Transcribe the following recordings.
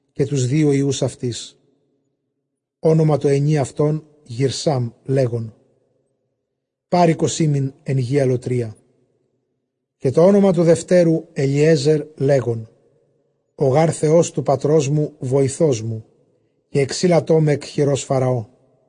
καὶ τοὺς δύο υἱοὺς αὐτῆς· ὄνομα τῷ ἑνὶ αὐτῶν Γηρσάμ, λέγων, πάροικος ἤμην ἐν γῇ ἀλλοτρίᾳ· καὶ τὸ ὄνομα τοῦ δευτέρου Ἐλίεζερ, λέγων, ὁ γὰρ Θεὸς τοῦ πατρός μου βοηθός μου, καὶ ἐξείλατό με ἐκ χειρὸς Φαραώ.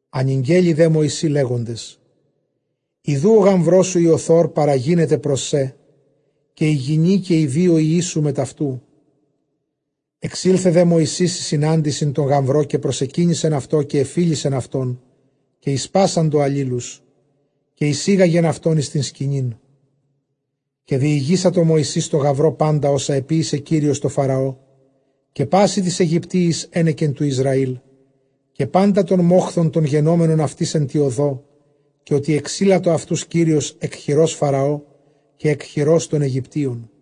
Ἀνηγγέλη δὲ Μωυσῇ, λέγοντες, ἰδοὺ ὁ γαμβρός σου Ἰοθὸρ παραγίνεται πρὸς σέ, καὶ ἡ γυνὴ καὶ οἱ δύο υἱοί σου μετʼ αὐτοῦ. Ἐξῆλθε δὲ Μωυσῆς εἰς συνάντησιν τῷ γαμβρῷ, καὶ προσεκύνησεν αὐτῷ, καὶ ἐφίλησεν αυτὸν, καὶ ἠσπάσαντο ἀλλήλους, καὶ εἰσήγαγεν αὐτοὺς εἰς τὴν σκηνήν. Καὶ διηγήσατο Μωυσῆς τῷ γαμβρῷ πάντα ὅσα ἐποίησε Κύριος τῷ Φαραῷ καὶ πᾶσι τοῖς Αἰγυπτίοις ἕνεκεν τοῦ Ἰσραήλ, καὶ πάντα τὸν μόχθον τὸν γενόμενον αὐτοῖς ἐν τῇ ὁδῷ, καὶ ὅτι ἐξείλατο αὐτοὺς Κύριος ἐκ χειρὸς Φαραὼ, καὶ ἐκ χειρὸς τῶν Αἰγυπτίων.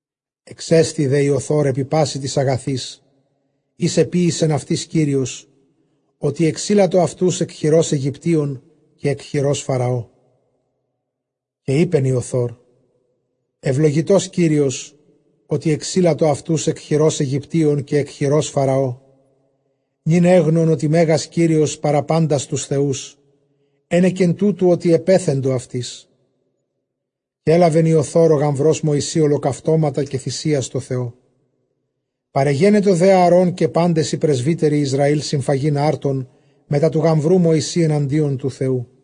Ἐξέστη δὲ Ἰοθὸρ ἐπὶ πᾶσι τοῖς ἀγαθοῖς οἷς ἐποίησεν αὐτοῖς Κύριος, ὅτι ἐξείλατο αὐτοὺς ἐκ χειρὸς Αἰγυπτίων καὶ ἐκ χειρὸς Φαραώ. Καὶ εἶπεν Ἰοθὸρ, εὐλογητὸς Κύριος, ὅτι ἐξείλατο αὐτοὺς ἐκ χειρὸς Αἰγυπτίων καὶ ἐκ χειρὸς Φαραώ. Νῦν ἔγνων ὅτι μέγας Κύριος παρὰ πάντας τοὺς θεούς ἕνεκεν τούτου, ὅτι ἐπέθεντο αὐτοῖς. Καὶ ἔλαβεν Ἰοθὸρ ὁ γαμβρὸς Μωυσῆ ὁλοκαυτώματα καὶ θυσίας τῷ Θεῷ· παρεγένετο δὲ Ἀαρὼν καὶ πάντες οἱ πρεσβύτεροι Ἰσραὴλ συμφαγεῖν ἄρτον μετὰ τοῦ γαμβροῦ Μωυσῆ, ἐναντίον τοῦ Θεοῦ.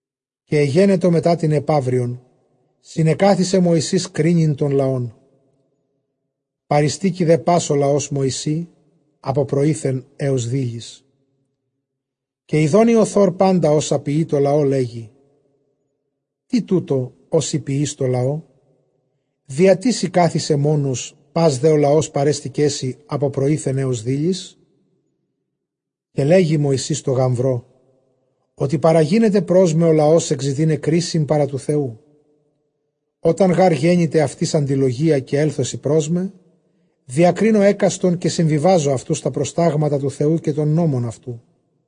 Καὶ ἐγένετο μετὰ τὴν ἐπαύριον συνεκάθισε Μωυσῆς κρίνειν τὸν λαόν· παρειστήκει δὲ πᾶς ὁ λαὸς Μωυσῇ ἀπὸ πρωΐθεν ἕως δείλης. Καὶ ἰδὼν Ἰοθὸρ πάντα ὅσα ποιεῖ τῷ λαῷ, λέγει, τί τοῦτο ὃ σὺ ποιεῖς τῷ λαῷ; διατί σὺ κάθησαι μόνος, πᾶς δὲ ὁ λαὸς παρέστηκέ σοι ἀπὸ πρωΐθεν ἕως δείλης; Καὶ λέγει Μωυσῆς τῷ γαμβρῶ, Ὅτι παραγίνεται πρός με ὁ λαὸς ἐκζητῆσαι κρίσιν παρὰ τοῦ Θεοῦ. Ὅταν γὰρ γένηται αὐτοῖς ἀντιλογία, καὶ ἔλθωσι πρός με, διακρίνω ἕκαστον, καὶ συμβιβάζω αὐτοὺς τὰ προστάγματα τοῦ Θεοῦ καὶ τὸν νόμον αὐτοῦ.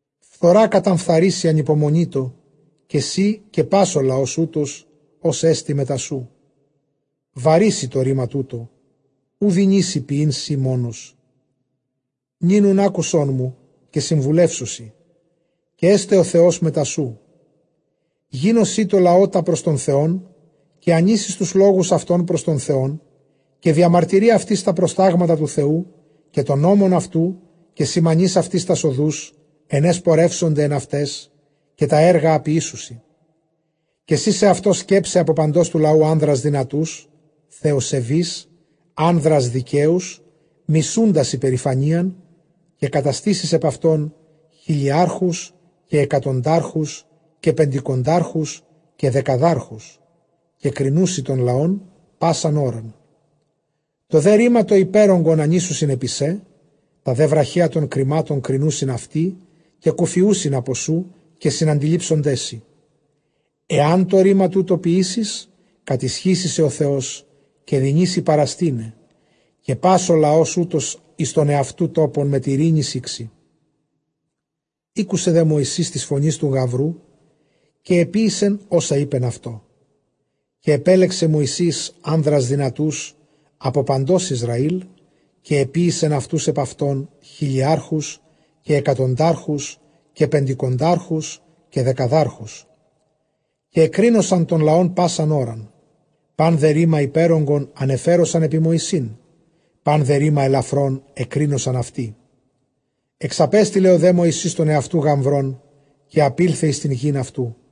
Φθορᾷ καταφθαρήσῃ ἀνυπομονήτῳ καὶ σὺ, καὶ πᾶς ὁ λαὸς οὗτος, ὅς ἐστι μετὰ σοῦ· βαρύ σοι τὸ ῥῆμα τοῦτο· οὐ δυνήσῃ ποιεῖν σὺ μόνος. Νῦν οὖν ἄκουσόν μου, καὶ συμβουλεύσω σοι, καὶ ἔσται ὁ Θεὸς μετὰ σοῦ· γίνου σὺ τῷ λαῷ τὰ πρὸς τὸν Θεὸν, καὶ ἀνοίσεις τοὺς λόγους αὐτῶν πρὸς τὸν Θεόν. Καὶ διαμαρτύρῇ αὐτοῖς τὰ προστάγματα τοῦ Θεοῦ καὶ τὸν νόμον αὐτοῦ, καὶ σημανεῖς αὐτοῖς τὰς ὁδοὺς ἐν αἷς πορεύσονται ἐν αὐταῖς, καὶ τὰ ἔργα ἃ ποιήσουσι. Καὶ σὺ σεαυτῷ σκέψαι ἀπὸ παντὸς τοῦ λαοῦ ἄνδρας δυνατοὺς, θεοσεβεῖς, ἄνδρας δικαίους, μισοῦντας ὑπερηφανίαν, καὶ καταστήσεις ἐπʼ αὐτῶν χιλιάρχους καὶ ἑκατοντάρχους καὶ πεντηκοντάρχους καὶ δεκαδάρχους. Καὶ κρινοῦσι τὸν λαὸν πᾶσαν ὥραν· τὸ δὲ ῥῆμα τὸ ὑπέρογκον ἀνοίσουσιν ἐπὶ σὲ· τὰ δὲ βραχέα τῶν κριμάτων κρινοῦσιν αὐτοί· καὶ κουφιοῦσιν ἀπὸ σοῦ, καὶ συναντιλήψονταί σοι. Ἐὰν τὸ ῥῆμα τοῦτο ποιήσῃς, κατισχύσει σε ὁ Θεὸς, καὶ δυνήσῃ παραστῆναι, καὶ πᾶς ὁ λαὸς οὗτος εἰς τὸν ἑαυτοῦ τόπον μετʼ εἰρήνης ἥξει. Ἤκουσε δὲ Μωυσῆς τῆς φωνῆς τοῦ γαμβροῦ, καὶ ἐποίησεν ὅσα εἶπεν αὐτῷ. Καὶ ἐπέλεξε Μωυσῆς ἄνδρας δυνατοὺς ἀπὸ παντὸς Ἰσραὴλ, καὶ ἐποίησεν αὐτοὺς ἐπʼ αὐτῶν χιλιάρχους καὶ ἑκατοντάρχους καὶ πεντηκοντάρχους καὶ δεκαδάρχους. Καὶ ἐκρίνοσαν τὸν λαὸν πᾶσαν ὥραν· πᾶν δὲ ῥῆμα ὑπέρογκον ἀνεφέροσαν ἐπὶ Μωυσῆν· πᾶν δὲ ῥῆμα ἐλαφρὸν ἐκρίνοσαν αὐτοί. Ἐξαπέστειλε δὲ Μωυσῆς τὸν ἑαυτοῦ γαμβρὸν, καὶ ἀπῆλθεν εἰς τὴν γῆν αὐτοῦ.